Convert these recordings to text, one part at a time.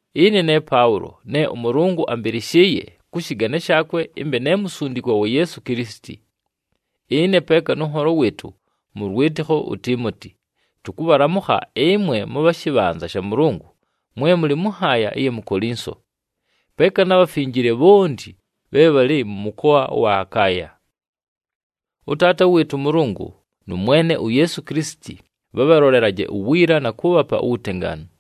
Ɨne ne Paʉlo, ne ʉMʉlʉngʉ ambɨlɨshɨɨye kʉ shɨgane shaakwe ɨmbe ne musundikwa wa Yeesu Kilisiti. Ɨne peeka nʉ nholo wɨɨtʉ mʉ lwɨtɨkho uTiimoti, tʉkʉbhalamʉkha ɨmwe mʉbha mʉ shɨbhanza sha Mʉlʉngʉ, mwe mʉlɨ mʉ nhaaya ɨya mu Kolinso, peeka na bhafinjile bhonti bhe bhalɨ mʉ mʉkoa ʉwa Akaaya. ɄTaata wɨɨtʉ ʉMʉlʉngʉ nʉ Mwene uYeesu Kilisiti bhabhalolelaje uwiila, na kʉʉbhapa uwutengaanu.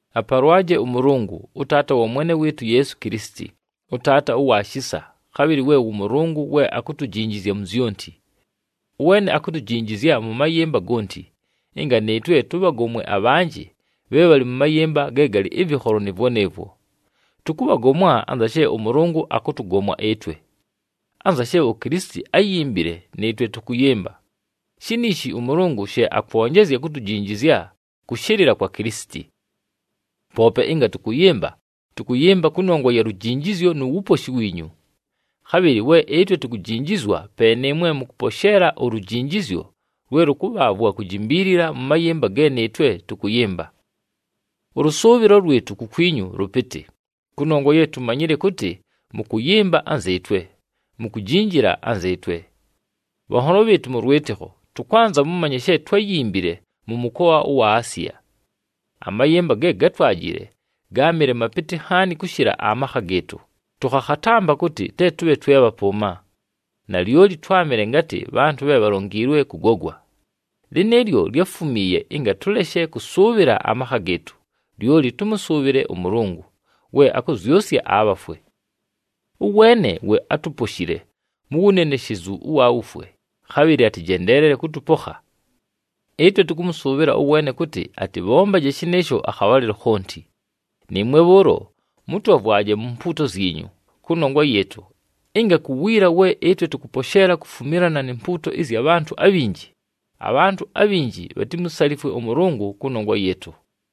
Apalwaje ʉMʉlʉngʉ, ʉTaata wa Mwene wɨɨtʉ uYeesu Kilisiti, ʉTaata ʉwa shisa, khabhɨlɨ we wʉ Mʉlʉngʉ we akutujinjizya mu zyonti. Ʉweene akutujinjizya mʉ mayɨmba gonti, ɨnga nɨɨtwe tʉbhagomwe abhanjɨ bhe bhalɨ mʉ mayɨmba ge galɨ ɨvɨkholo nɨɨvwo nɨɨvwo. Tʉkʉbhagomwa anza she ʉMʉlʉngʉ akʉtʉgomwa ɨtwe. Anza she uKilisiti áyimbile nɨɨtwe tʉkʉyɨmba, shiniishi ʉMʉlʉngʉ she akwonjezya kutujinjizya kʉshɨlɨla kwa Kilisiti. Poope ɨnga tʉkʉyɨmba, tʉkʉyɨmba kʉnongwa ya lujinjizyo nu wuposhi wiinyu. Khabhɨlɨ we ɨtwe tukujinjizwa pe nɨɨmwe mʉkʉposheela ulujinjizyo lwe lʉkʉbhaavwa kujimbiilila mʉ mayɨmba ge nɨɨtwe tʉkʉyɨmba. Ʉlʉsʉʉbhɨlo lwɨtʉ kukwinyu lʉpɨtɨ, kʉnongwa ye tumanyile kʉtɨ mʉkʉyɨmba anzɨɨtwe, mukujinjila anzɨɨtwe. Bhanholo bhɨɨtʉ mʉ lwɨtɨkho, tʉkwanza mʉmanye she twáyimbile mʉ mʉkoa ʉwa Asiya. Amayɨmba ge gátwajile gáamɨle mapɨtɨ nhaani kʉshɨla amakha gɨɨtʉ, tʉkhakhatampa kʉtɨ te tʉbhe twe bhapʉʉma. Nalyoli twámɨle ngatɨ bhantʉ bhe bhalongiilwe kʉgogwa. Lɨnɨɨlyo lyáfumiiye ɨnga tʉleshe kʉsʉʉbhɨla amakha gɨɨtʉ, lyoli tʉmʉsʉʉbhɨle ʉMʉlʉngʉ, we akʉzyʉsya abhafwe. Ʉweene we átuposhile mu wuneneshezu ʉwa wufwe, khabhɨlɨ atɨjendeelele kʉtʉpokha. Ɨtwe tʉkʉmʉsʉʉbhɨla ʉweene kʉtɨ atɨbhombaje shɨnɨɨsho akhabhalɨlo khonti, nɨɨmwe bhʉʉlo mʉtwavwaje mu mpuuto zyinyu kʉnongwa yɨɨtʉ, ɨnga ku wiila we ɨtwe tʉkʉposheela kufumilana ni mpuuto ɨzya bhantʉ abhinji, abhantʉ abhinji bhatimusalifwe ʉMʉlʉngʉ kʉnongwa yɨɨtʉ.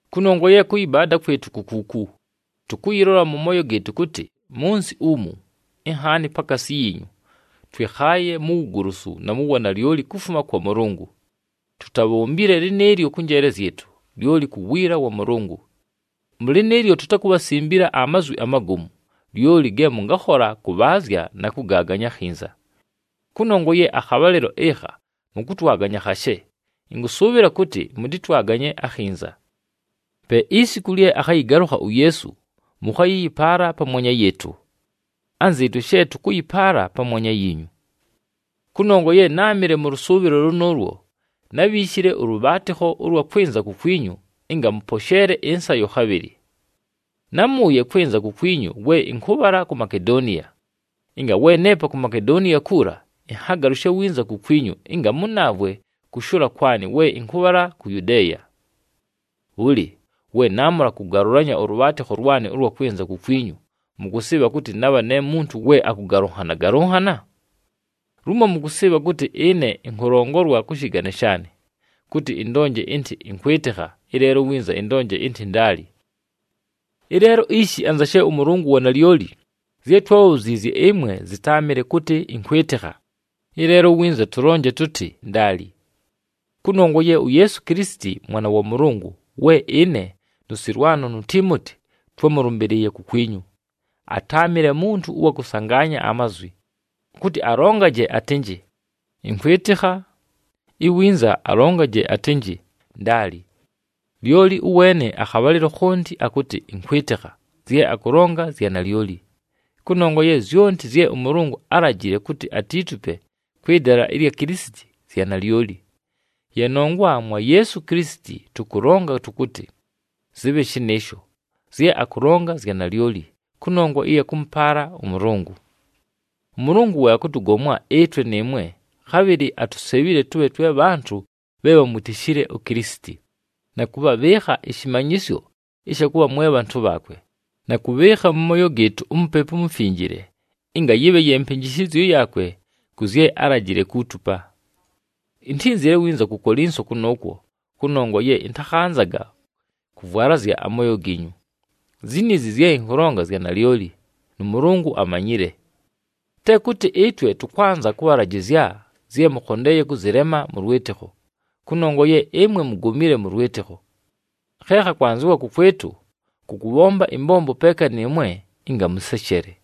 Kʉnongwa ye kʉyɨbaada kwɨtʉ ku kuuku: tʉkʉyɨlola mʉ mooyo gɨɨtʉ kʉtɨ, mʉ nsɨ umu, inhaani pakaasi yiinyu, twɨkhaaye mu wugolosu na mu wanalyoli kufuma kwa Mʉlʉngʉ. Tutabhombile lɨnɨɨlyo kʉ njeele zyɨtʉ, lyoli ku wiila wa Mʉlʉngʉ. Mʉ lɨnɨɨlyo tutakubhasimbila amazwi amagomu, lyoli ge mʉngakhola kʉbhaazya na kʉgaaganya akhinza. Kʉnongwa ye akhabhalɨlo ɨkha mʉkʉtwaganya khashe, ɨnkʉsʉʉbhɨla kʉtɨ mʉtɨtwaganye akhinza. Pe isiku lye akhayɨgalʉkha uYeesu, mʉkhayɨyɨpaala pamwanya yɨɨtʉ, anzɨɨtwe she tʉkʉyɨpaala pamwanya yiinyu. Kʉnongwa ye náamɨle mʉ lʉsʉʉbhɨlo lʉnʉʉlwo, nábhiishile ʉlʉbhaatɨkho ʉlwa kwɨnza kukwinyu ɨnga mʉposheele ɨnsayo khabhɨlɨ. Námʉʉye kwɨnza kukwinyu we ɨnkʉbhala ku Makedoniya, ɨnga we neepa ku Makedoniya kuula, ɨnhagalʉshe winza kukwinyu ɨnga mʉnaavwe kʉshʉʉla kwanɨ we ɨnkʉbhala ku Yudeeya. Bhʉlɨ, we naamʉla kʉgalʉlanya ʉlʉbhaatɨkho lwanɨ ʉlwa kwɨnza kukwinyu, mʉkʉsɨɨbha kʉtɨ nabha ne muntu we akʉgalʉnhana-galʉnhana? Lumo mʉkʉsɨɨbha kʉtɨ ɨne ɨnkʉlongolwa kʉ shɨgane shaanɨ, kʉtɨ ɨndonje ɨntɨ, “Ɨnkwɨtɨkha,” ɨleelo iwinza ɨndonje ɨntɨ, “Ndaali!” Ɨleelo ishi anza she ʉMʉlʉngʉ wa nalyoli, zye twábhabhuziizye ɨmwe, zɨtáamɨle kʉtɨ, “Ɨnkwɨtɨkha,” ɨleelo iwinza tʉlonje tʉtɨ, “Ndaali.” Kʉnongwa ye uYeesu Kilisiti Mwana wa Mʉlʉngʉ we ɨne, nʉ Sɨlwano nu Tiimoti twámʉlʉmbɨlɨɨye kukwinyu, atáamɨle muntu ʉwa kʉsangaanya amazwi kʉtɨ alongaje atɨnjɨ, “Ɨnkwɨtɨkha,” iwinza alongaje atɨnjɨ, “Ndaali,” lyoli ʉweene akhabhalɨlo khonti akʉtɨ, “Ɨnkwɨtɨkha,” zye akʉlonga zya nalyoli. Kʉnongwa ye zyonti zye ʉMʉlʉngʉ álajile kʉtɨ atiitupe kwɨ dala ɨlya Kilisiti, zya nalyoli. Ye nongwa mwa Yeesu Kilisiti tʉkʉlonga tʉkʉtɨ, “Zɨbhe shɨnɨɨsho,” zye akʉlonga zya nalyoli, kʉnongwa ɨya kʉmʉpaala ʉMʉlʉngʉ. ɄMʉlʉngʉ we akʉtʉgomwa ɨtwe nɨɨmwe, khabhɨlɨ atusebhile tʉbhe twe bhantʉ bhe bhamwitishile uKilisiti, na kʉbhabhɨɨkha ɨshɨmanyɨsyo ɨsha kʉbha mwe bhantʉ bhaakwe, na kʉbhɨɨkha mʉ mooyo gɨɨtʉ uMupepu uMufinjile ɨnga yɨbhe ye mpɨnjɨshɨzyo yaakwe kʉ zye álajile kuutupa. Intínzile winza ku Kolinso kʉnʉʉkwo, kʉnongwa ye ɨntakhanzaga kʉvwalazya amooyo giinyu. Ziniizi zye ɨnkʉlonga zya nalyoli, nʉ Mʉlʉngʉ amanyile. Te kʉtɨ ɨtwe tʉkwanza kʉbhalajɨzya zye mʉkhondeeye kʉzɨlema mʉ lwɨtɨkho, kʉnongwa ye ɨmwe mugomile mʉ lwɨtɨkho. Khe khakwanzɨwa kʉkwɨtʉ, kʉ kʉbhomba ɨmbombo peeka nɨɨmwe ɨnga mʉseshele.